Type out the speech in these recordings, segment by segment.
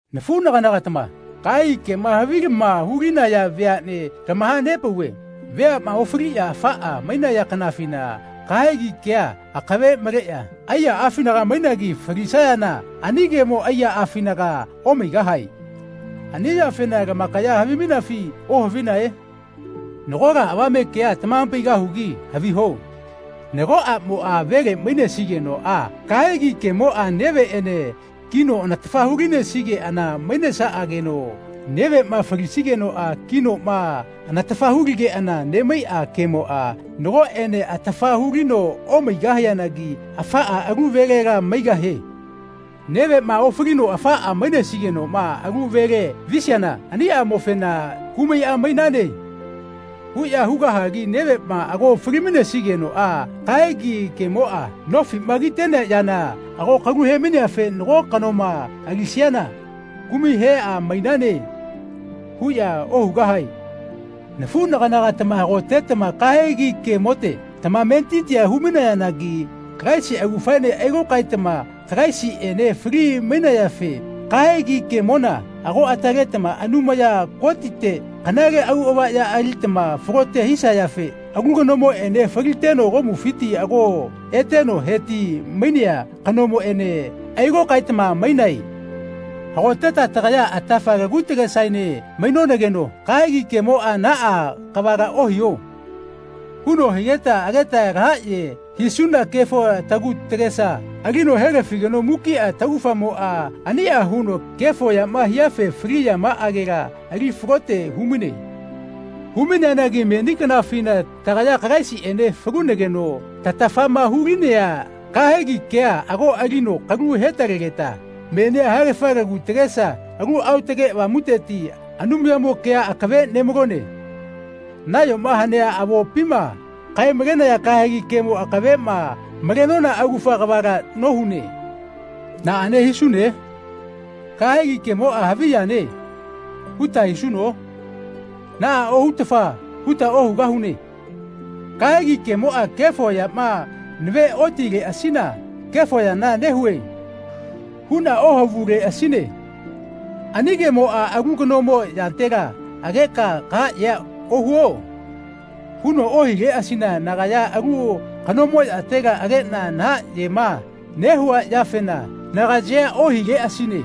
Nafuꞌnaganagatama, kahegi kema havilama hulinaya veaꞌne, tamahanepauve veaꞌma ofaliꞌya afaꞌa mainaya kanafina kahegi kea akave maleꞌya aiyaꞌafinaga mainagi falisayana ani kemo aiyaꞌafinaga omaigahae. Ani yafena lamakaya havimainafi ohavinae? Nagola avame kea tamahapaigahugi haviho. Nago aꞌmoꞌa vele mainesigenoꞌa kahegi kemoꞌa neveꞌene kino anatafa hulisigeꞌana mainesaꞌanageno neveꞌma falisigenoꞌa kinoꞌma anatafa huligeꞌana nemaiꞌa kemoꞌa nagoꞌene atafa hulino omaigahianagi afaꞌa alu velela maigahie. Neveꞌma ofalino afaꞌa mainesigenoꞌma alu vele visiana ani aꞌmofena “Kumai a mainane.” huꞌya hugahagi neveꞌma ago falisigenoꞌa kahegi kemoꞌa nofiꞌma kitenea yana ago kalu hemaineafe nago kanoma alisiana “Kumai he a mainane.” huꞌya ohugahae. Nafuꞌnaganagatama hagotetama kahegi kemote tamametitia humainagi Kalaisi augafaene ailokaetama Kalaisiꞌene fali-mainayafe kahegi kemona ago ataletama Anumaya Kotite kanale auꞌava ya alitama falote hisayafe alu kanomoꞌene, faliteno komufiti ago eteno heti-mainea kanomoꞌene, ailokaetama mainae. Hagoteta tagaya atafa lagu tagesaene mainonageno kahegi kemoꞌa “Naꞌa kavala ohiho.” huno higeta ageta lahaꞌye hisuna kefo tagu tagesa alino helafigeno mukiꞌa taugafamoꞌa aniꞌa huno kefo yama hiafe fali yamaꞌagela ali falote humaine. Humaineanagi meni kanafina tagaya Kalaisiꞌene falunageno tatafama hulinea kahegi kea ago alino kalu hetalegeta menia haegafa lagu tagesa Alu Aotage Avamuteti Anumayamo kea akave nemalone. Nayoma hanea avopima kae-malenaya kahegi kemo akaveꞌma malenona augafa kavala nohune. Naꞌane hisune? “Kahegi kemoꞌa havi yane.” huta hisuno? Naꞌa ohutafa huta ohugahune. Kahegi kemoꞌa kefo yama naveꞌotileꞌasina “Kefo yana nehue.” huꞌna ohavuleꞌasine. Ani kemoꞌa “Alu kanomo yatela ageka kahaꞌyea ohuo.” huno ohileꞌasina nagaya alu kanomo yatela ageꞌna nahaꞌyema nehua yafena nagayea ohileꞌasine.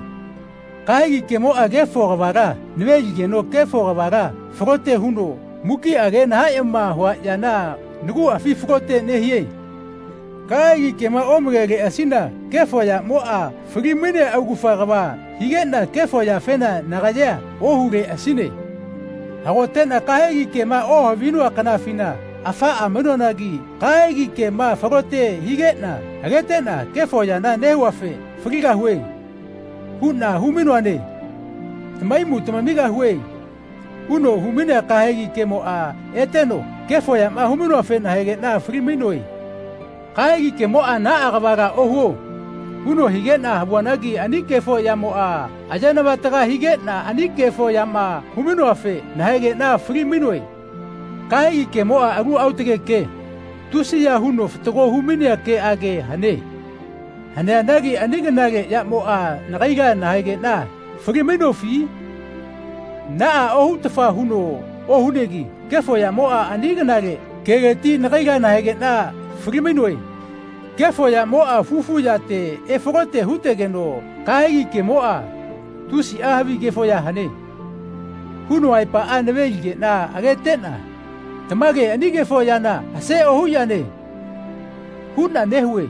Kahegi kemoꞌa kefo kavala naveligeno kefo kavala falote huno mukiꞌa age nahaꞌyema hua yana naguꞌafi falote nehie. Kahegi kema omaleleꞌasina kefo yaꞌmoꞌa fali-mainea augufa kava higeꞌna kefo yafena nagayea ohuleꞌasine. Hagoteꞌna kahegi kema ohavinoa kanafina afaꞌa mainoanagi kahegi kema falote higeꞌna ageteꞌna “Kefo yana nehuafe faligahue.” huꞌna humainoane. “Tamahaimu tamamigahue.” huno humainea kahegi kemoꞌa eteno kefo yama humainoafe nahaegeꞌna fali-mainoe. Kahegi kemoꞌa “Naꞌa kavala ohuo.” huno higeꞌna havuanagi ani kefo yamoꞌa ayenavataga higeꞌna ani kefo yama humainoafe nahaegeꞌna fali-mainoe. Kahegi kemoꞌa alu aotage ke, tusiya huno fatago humainea keꞌage hane. Haneanagi ani kanale yamoꞌa nagaila nahaegeꞌna falimainofi? Naꞌa ohutafa huno ohunegi kefo yamoꞌa ani kanale keleti nagaila nahaegeꞌna falimainoe. Kefo yamoꞌa fufu yate efalote hutegeno kahegi kemoꞌa “Tusiꞌa havi kefo ya hane.” huno aepaꞌa naveligeꞌna ageteꞌna “Tamage ani kefo yana ase ohu yane.” huꞌna nehue.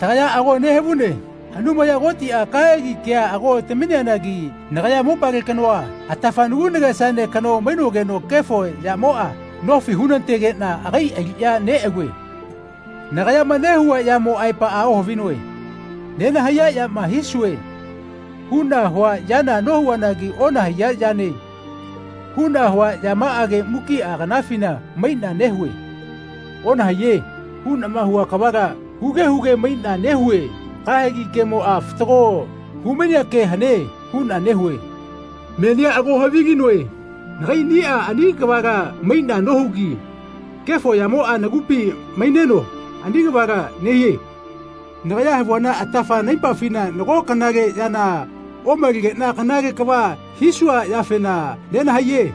Tagaya ago nehavune Anumaya Kotiꞌa kahegi kea ago tamineanagi nagaya mopale kanoa atafa nagu nagesaene kano mainogeno kefo yamoꞌa nofi hunategeꞌna agai aliꞌya neꞌalue. Nagayama nehua yamo aepaꞌa ohavinoe. “Nenahaiya yama hisue.” huꞌna hua yana nohuanagi “Onahaiya yane.” huꞌna hua yamaꞌage mukiꞌa kanafina maiꞌna nehue. “Onahaiye.” huꞌnama hua kavala huge huge maiꞌna nehue “Kahegi kemoꞌa fatago humainea ke hane.” huꞌna nehue. Menia ago havilinoe nagaiꞌniꞌa ani kavala maiꞌna nohugi kefo yamoꞌa nagupi maineno ani kavala nehie. Nagaya havuana atafa naipafina nago kanale yana omalegeꞌna “Kanale kava hisua yafena nenahaiye.”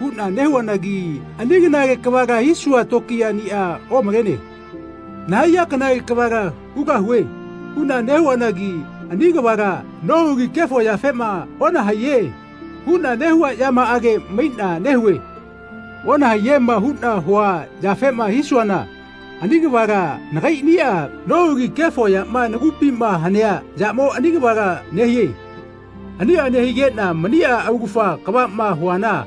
huꞌna nehuanagi ani kanale kavala hisua tokiyaꞌnia omalene. “Nahaiya kanale kavala hugahue.” huꞌna nehuanagi ani kavala nohugi kefo yafema “Onahaiye.” huꞌna nehua yamaꞌage maiꞌna nehue. “Onahaiyema.” huꞌna hua yafema hisuana ani kavala nakaiꞌniꞌa nohugi kefo yama nagupima hanea yamo ani kavala nehie. Aniꞌa nehigeꞌna maniꞌa augafa kavaꞌma huana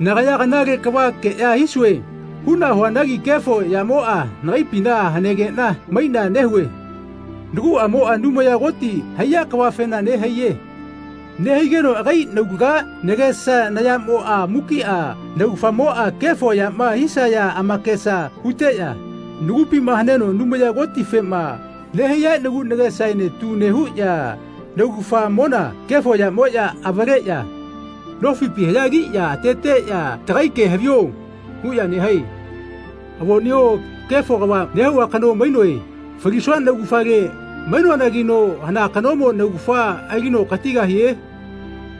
nagaya “Kanale kavakeꞌya hisue.” huꞌna huanagi kefo yamoꞌa nagaipina hanegeꞌna maiꞌna nehue. Naguꞌamoꞌa Anumaya Koti haiya kavafena nehaiye. Nehaigenoꞌagi naulaga, nagesa, nayamoꞌa mukiꞌa naugafamoꞌa kefo yama hisaya amakesa huteꞌya nagupima haneno Anumaya Kotifema nehaiya nagu nagesaene tu nehuꞌya naugafamona kefo yamoꞌya avaleꞌya nofipi haꞌyagiꞌya ateteꞌya “Tagai ke havio.” huꞌya nehae. Avoꞌneo kefo kava nehua kano mainoe. Falisua naugafale mainoanagino hana kanomo naugafa alino katigahie?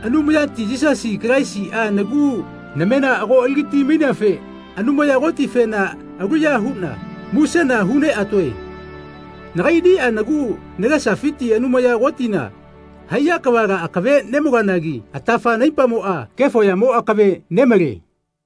Anumayati Yisasi Kalaisiꞌa nagu namena ago aligati-maineafe Anumaya Kotifena aluya huꞌna musena huneꞌatoe. Nagaiꞌniꞌa nagu nagesafiti Anumaya Kotina haiya kavala akave nemaloanagi atafa naipamoꞌa kefo yamo akave nemale.